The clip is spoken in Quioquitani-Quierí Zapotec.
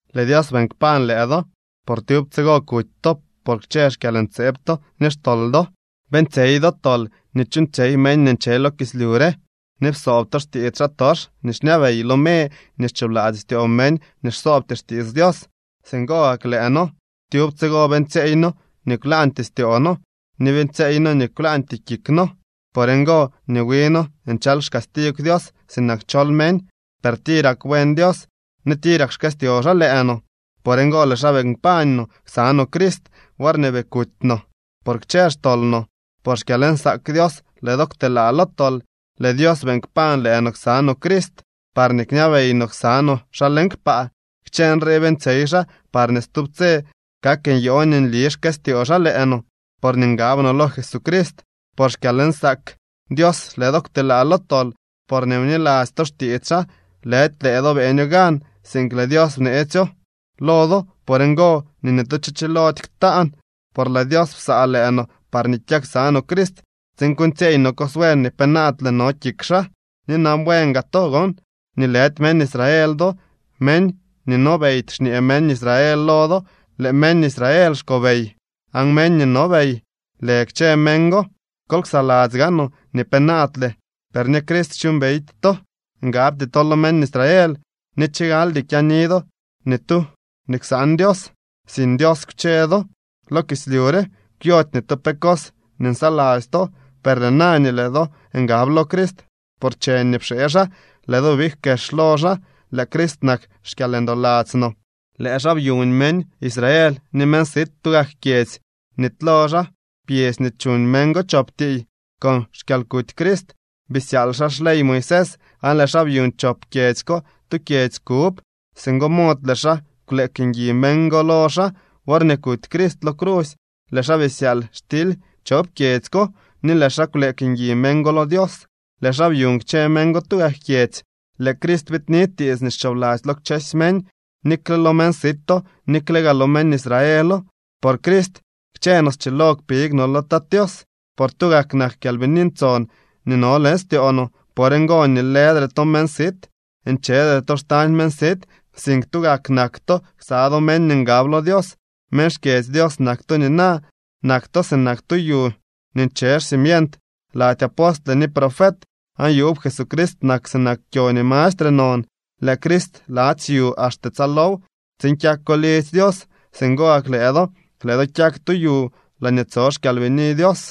Lëë Dios beeñ kpañ lëë do, por tyub tsigo kuty to por kchë xkyalntseeb to ni xtol do. Beeñtsyey do tol nii chuuñtsyey meñ nii nche lo kislyu re, ni psoob to xtiits xaatox nii xñabey lo me ni xchoobladzy styoo meñ nii xsoobty xtiits Dios. Singo gak lëë noo tyub tsigo beeñtsyeey noo nii kwlaañtyee styoo noo ni beeñtsyeey noo nii kwlaañtyee kik noo. Por ngo nii wi noo nchal xcastigw Dios, sinak chol meñ. Per tirak buen Dios, ni tirak xkëstyoo xaa lëë no. Por ngo lëë xaa beeñ kpañ no ksa no Crist, worñee bii kuuty no por kchë xtol no. Por xkyalnsaak Dios lëë do kwtelaa lo tol. Lëë Dios beeñ kpañ lëë no ksa no Crist, parñee kñabey no ksa no xaa leñ kpaa. Kchë nrii beeñtsyey xaa parñee stub tse kak nyoo nii nli xkëstyoo xaa lëë no, porñee ngab no lo Jesucrist. Por xkyalnsaak Dios lëë do kwtelaa lo tol, porñee bniladzy to xtiits xaa. Lëdy lëë do beeño gan, sink lëë Dios bneetsyo lo do. Por ngo nii ni tu cho chilody ktaan. Por lëë Dios psaa lëë no parñee kyak ksa no Crist tsiin kuuñtsyeey no cos buen nii penaadle no kik xaa. Ni nan bueen gaa to gon nii lëdy meñ Israel do. Meñ nii nobeydy xñee meñ Israel lo do. Lëë meñ Israel xkobey aan meñ nii nobey lë kchë meñ go. Kol ksaladzy gaanoo nii penaadle per ni Crist xyuumbeydy to. Ngabty to lo meñ Israel ni chigaldy kyaani do ni tu nii ksaan Dios. Sin Dios kwche do lo kislyu re. Kwyody ni tu pe cos nii nsaladzy to. Per lëë na nii lëë do ngab lo Crist por cheñ nii pxee xaa, lëë do big kex lo xaa. Lëë Crist nak xkyalndoladzy no. Lëë xaa byuñ meñ Israel ni meñ sit tugak kyedzy. Bnitylo xaa pyedzy nii chuñ meñ go chop tiiy. Con xkyalkuty Crist bisyaal xaa xley Moisés aan lëë xaa byuñ chop kyedzy ko tu kyedzy kub. Singo mod lëë xaa kwleek ngui meñ go lo xaa. Worñee kuty Crist lo crusy lëë xaa bisyaal xtily chop kyedzy ko, ni lëë xaa kwleek ngui meñ go lo Dios. Lëë xaa byuñ kchë meñ go tugak kyedzy. Lëë Crist biidni tiits nii xchoobladzy lo kchësy meñ, nikle lo meñ sito, nikle gaa lo meñ Israelo. Por Crist kchë no schilo kpig no lo Tat Tios por tugak nak Kyalbini Ntson nii no leñ styoo no. Por ngo nii lëdre to meñ sit, nchedre to xtañ meñ sit, sink tugak nak to ksa do meñ nii ngab lo Dios. Meñ xkyedzy Dios nak to nina. Nak to sinak tu yu nii nche xcimient lady apostle ni profet, aan yuub Jesucrist nak sinak kyo nii mastre non. Lëë Crist ladzy yu axte tsaalow, tsiin kyako lidzy Dios. Singo gak lëë do, lëë do kyak tu yu laañee tso xKyalbini Dios.